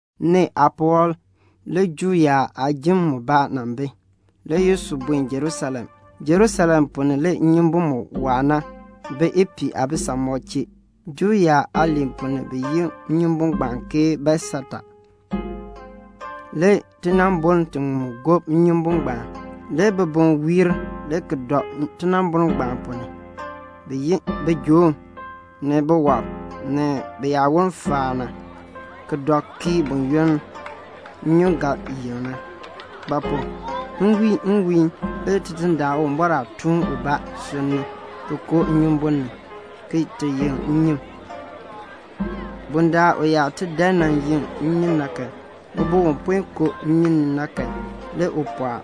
Nee aapuwɔb le Juu yaab aajim mubaa nan bi. Le Yesu buen Jerusalem. Jerusalem ponn ni le nnyumbun mu waa na bi ipiih aabisamɔb chee. Juu yaab aaliin ponn ni bi yi nnyumbun ngbaan ke Betsata. Le tinaamboln tiŋmu gob nnyumbun ngbaan. Le bibum wiir le ki dɔ tinaamboln ngbaan ponn ni. Bi ye bijoom, ni biwɔb, ni biyaawon faan na, [ki dɔ kii buyoonn nnyun ga yeŋ na; ba pu? nwiin nwiin le Tidindaan Uwumbɔr aatuun ubaa sunn ni ki koo nnyumbun ni, ki ti yeŋ nnyun. Bundaln u yaa ti dan nan yeŋ nnyun na kan, ubun u puen koo nnyun ni na kan, le u pɔɔk.]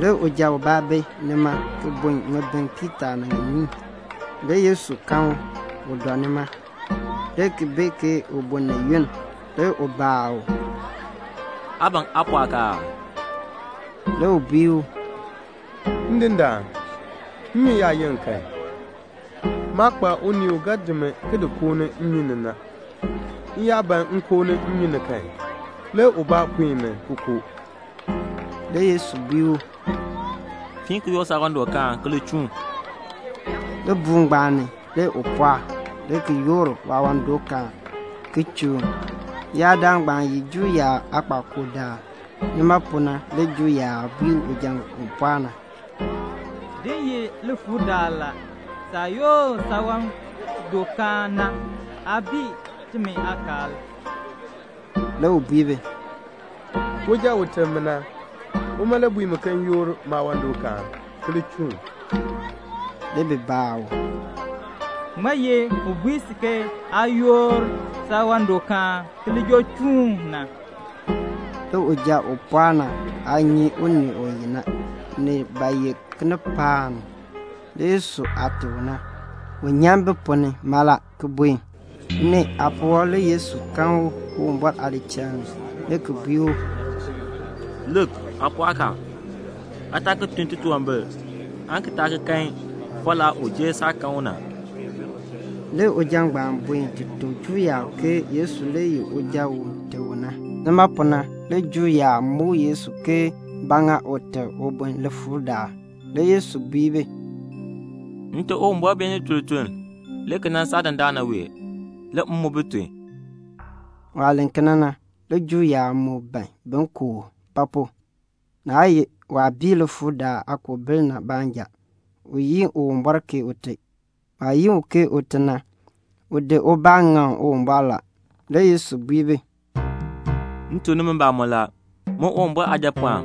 Le uja ubaa bi nima ki bun ŋibin piitaa ni ŋiniin. Le Yesu kan u, u dɔ nima, le ki bee ke u bun ni yunn. Le u baa u, "Aa ban aa pɔɔk aa?" Le u bui u, "Ndindaan, nnyun yaa yeŋ kan, maa kpa unii u ga di mi ki di koon nnyun ni na. M yaa ban m koo nnyun ni kan, le ubaa puen mi ki koo." Le Yesu bui u, "Fiin ki yoor saawandɔkaan ki li chuun." Libuul ngbaan ni le u pɔɔk, le ki yoor waawandɔkaan, ki chuun. Leyaadaal ngbaan ye Juu yaab aakpakool daal. Nima pu na le Juu yaab bui uja u pɔɔk na, "Din ye likpakool la. Saah yoor saawandɔkaan na, aa bii timi aakaal." Le u bui bi, "Uja u teb mi na, uma le bui mi ke m yoor maawandɔkaan ki li chuun." Le bi baa u, "Ŋmaa ye u bui si ke aa yoor saawandɔkaan ki li joo chuun na?" Le uja u pɔɔk na aa nyi unii u ye na; ni ba ye kinipaak ni, le Yesu aah teb u na, u nyan bi ponn ni mala, ki buen. Nee aapuwɔb le Yesu kan u Uwumbɔr aadichal ni le ki bui u, "Lik, aa pɔɔk a. Aa taa ki tun titunwambir aan ki taa ki kan falaa u jer saah kan u na." Le uja ngbaan buen ti tuk Juu yaab ke Yesu le ye uja u teb u na. Nima pu na le Juu yaab muk Yesu ke ba ŋa u teb ubun likpakool daal. Le Yesu bui bi, "Nte Uwumbɔr beenin tun lituln le ki nan saa dandana wee, le m mu bi tun." Waah len kena na, le Juu yaab moo ban bin ku u; ba pu? naa ye waah bii likpakool daal aakoobil na baanja, u yi Uwumbɔr ke Ute. Waah yi u ke Ute na, u di ubaa ŋaŋ Uwumbɔr la. Le Yesu bui bi, "M tuk nimi mbamɔn la, min Uwumbɔr Aajapɔɔn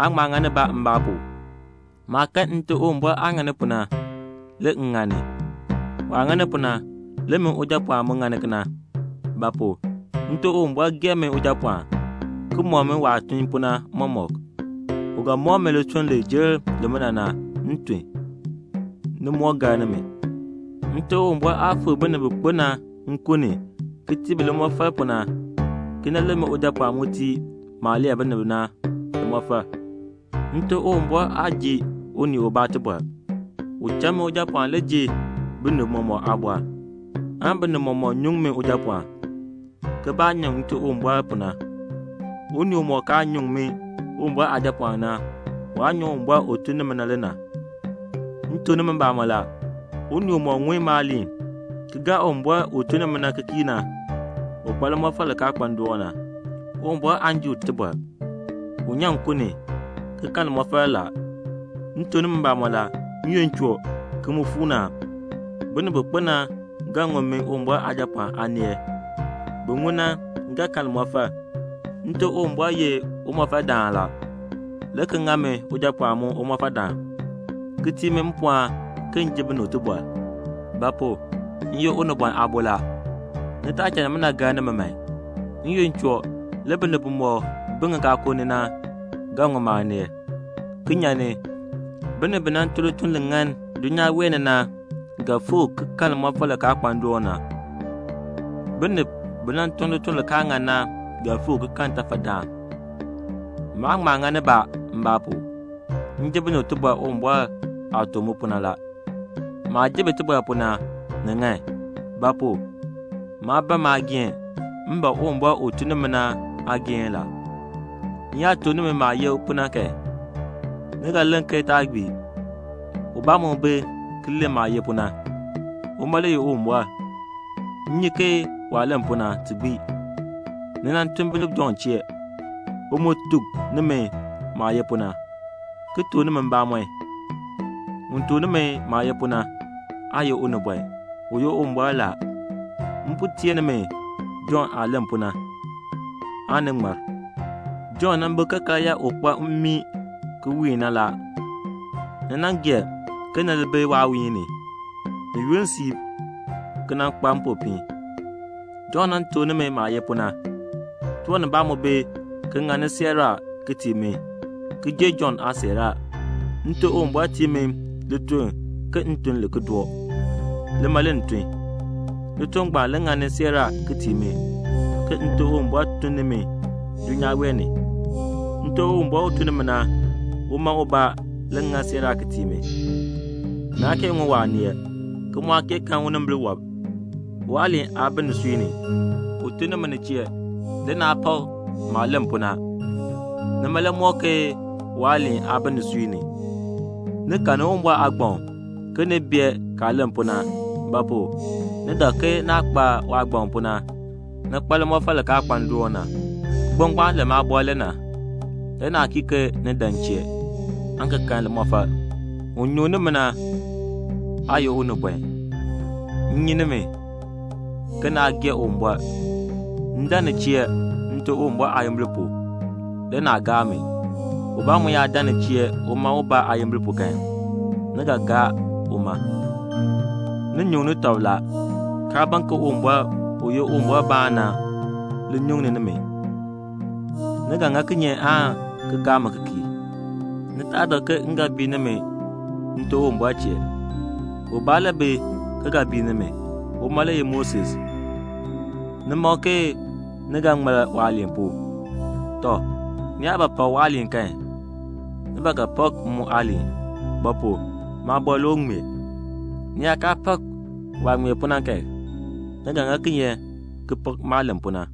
aa ŋma ŋa nibaa mbaa pu. Maah kan Nte Uwumbɔr aah ŋani pu na, le m ŋani; waah ŋani pu na, le min Ujapɔɔn mu ŋani kena; ba pu? Nte Uwumbɔr gee mi Ujapɔɔn, ki mɔk mi waah tun pu na mɔmɔk. U ga mɔk mi lituln li jer limina na, m tun, ni moo gar nimi. Nte Uwumbɔr aah fikr binib bi kpo na nkun ni, ki tii bi limɔfal pu na, kena le min Ujapɔɔn mu tii maah lee bi na limɔfal. Nte Uwumbɔr aa ji unii ubaa tibɔr, u cha min Ujapɔɔn le ji binib mɔmɔk aabɔr, aan binib mɔmɔk nyuŋ min Ujapɔɔn, ke baah nyuŋ Nte Uwumbɔr pu na. Unii umɔk kaa nyuŋ min Uwumbɔr Aajapɔɔn na, waa nyuŋ Uwumbɔr u tun ni mi na le na. "M tuk nimi mbamɔn la, unii umɔk ŋun maaliin ki gaa Uwumbɔr u tun ni mi na ki kii na, u kpa limɔfal li kaa kpa ndoon na. Uwumbɔr aan ji u tibɔr. U nyan nkun ni, ki kan limɔfal la. M tuk nimi mbamɔn la, n-yoonn choo, ki mu fuu ni a, binib bi kpo na ga ŋun min Uwumbɔr Aajapɔɔn aaneel. Bin ŋun na ga kan limɔfal. Nte Uwumbɔr ye Umɔfaldaan la, le ki ŋa min Ujapɔɔn mu Umɔfaldaan, ki tii mi mpɔɔn ke m ji binib tibɔr; ba pu? m ye Unibɔn Aabo la. Ni taa cha nimina gar nimi man. N-yoonn choo, le binib bimɔk bi ŋikaakul ni na ga ŋun maaneel, ki nyan ni. Binib bi nan tun lituln li ŋan na dulnyaa wee ni na ga fikr ki kan limɔfal li kaa kpa ndoon na. Binib bi nan tun lituln li kaa ŋan na ga fikr ki kan ntafadaan." "Maa ŋma ŋa nibaa mbaa pu. M ji binib tibɔr Uwumbɔr aah tuk mi pu na la. Maah ji bi tibɔr pu na, ni ŋan; ba pu? maa ban maageehn, m ban Uwumbɔr u tun ni mi na aageehn la. "M yaa tuk nimi maah ye pu na kan, ni ga len ke taa gbii. Ubaa mu bi ki len maah ye pu na. Uma le ye Uwumbɔr. M nyi ke waah len pu na, ti gbii. Ni nan tun binib Jɔnn chee. U mu tuk nimi maah ye pu na, ki tuk nimi mbamɔn. Un tuk nimi maah ye pu na, aa ye unibɔn, u ye Uwumbɔr la. M po teer nimi Jɔnn aah len pu na, aan ni ŋmar. Jɔnn nan bi ke karyaa u kpa mmii ki wiin na la. Ni nan gee ke ni li bi waawiihn ni, ni yunn siib, ki nan kpa mpopiin. Jɔnn nan tuk nimi maah ye pu na. Tiwan nibaa mu bi ki ŋani siiraa ki tii mi, ki jer Jɔnn aasiiraa. Nte Uwumbɔr tii mi lituln ke m tun li ki doo. Lima le m tun. Lituln ngbaan le ŋani siiraa ki tii mi, ke Nte Uwumbɔr tun ni mi dulnyaa wee ni. Nte Uwumbɔr u tun ni mi na, uma ubaa le ŋa siiraa ki tii mi. Naa kee ŋun waaneel, ki mu aa kee kan unimbil wɔb. Waaliin aa bi nisui ni; u tun ni mi ni chee, le naa pak maah len pu na; nima le mɔk ke waaliin aa bi nisui ni. Ni karni Uwumbɔr aagbaŋ ke ni bee kaah len pu na; ba pu? ni dak ke naah kpa waagbaŋ pu na, ni kpa limɔfal li kaa kpa ndoon na. Kigbaŋ ngbaan len maabɔr le na. Le naa kii ke ni dan m chee, aan ki kan limɔfal. "Un nyuŋni mi na aa ye unibɔn. M nyi nimi, ke naa gee Uwumbɔr. M dan ni chee Nte Uwumbɔr aayimbil pu, le naa gaa mi. Ubaa mu yaa dan ni chee uma ubaa aayimbil pu kan, ni ga gaa uma. Ni nyuŋni tɔb la, kaa ban ke Uwumbɔr, u ye Uwumbɔrbaan na, li nyuŋ nimi. Ni ga ŋa kinye aan ki gaa mi ki kii? Ni taa dak ke m ga bii nimi Nte Uwumbɔr chee. Ubaa le bi ki ga bii nimi. Uma le ye Moses. Ni mak ke ni ga ŋmar waaliin pu. Tɔ, ni yaa ba pak waaliin kan, ni ba ga pak m mu aaliin; ba pu? maabɔr le u ŋmee. Ni yaa kaa pak waah ŋmee pu na kan, ni ga ŋa kinye ki pak maah len pu na?"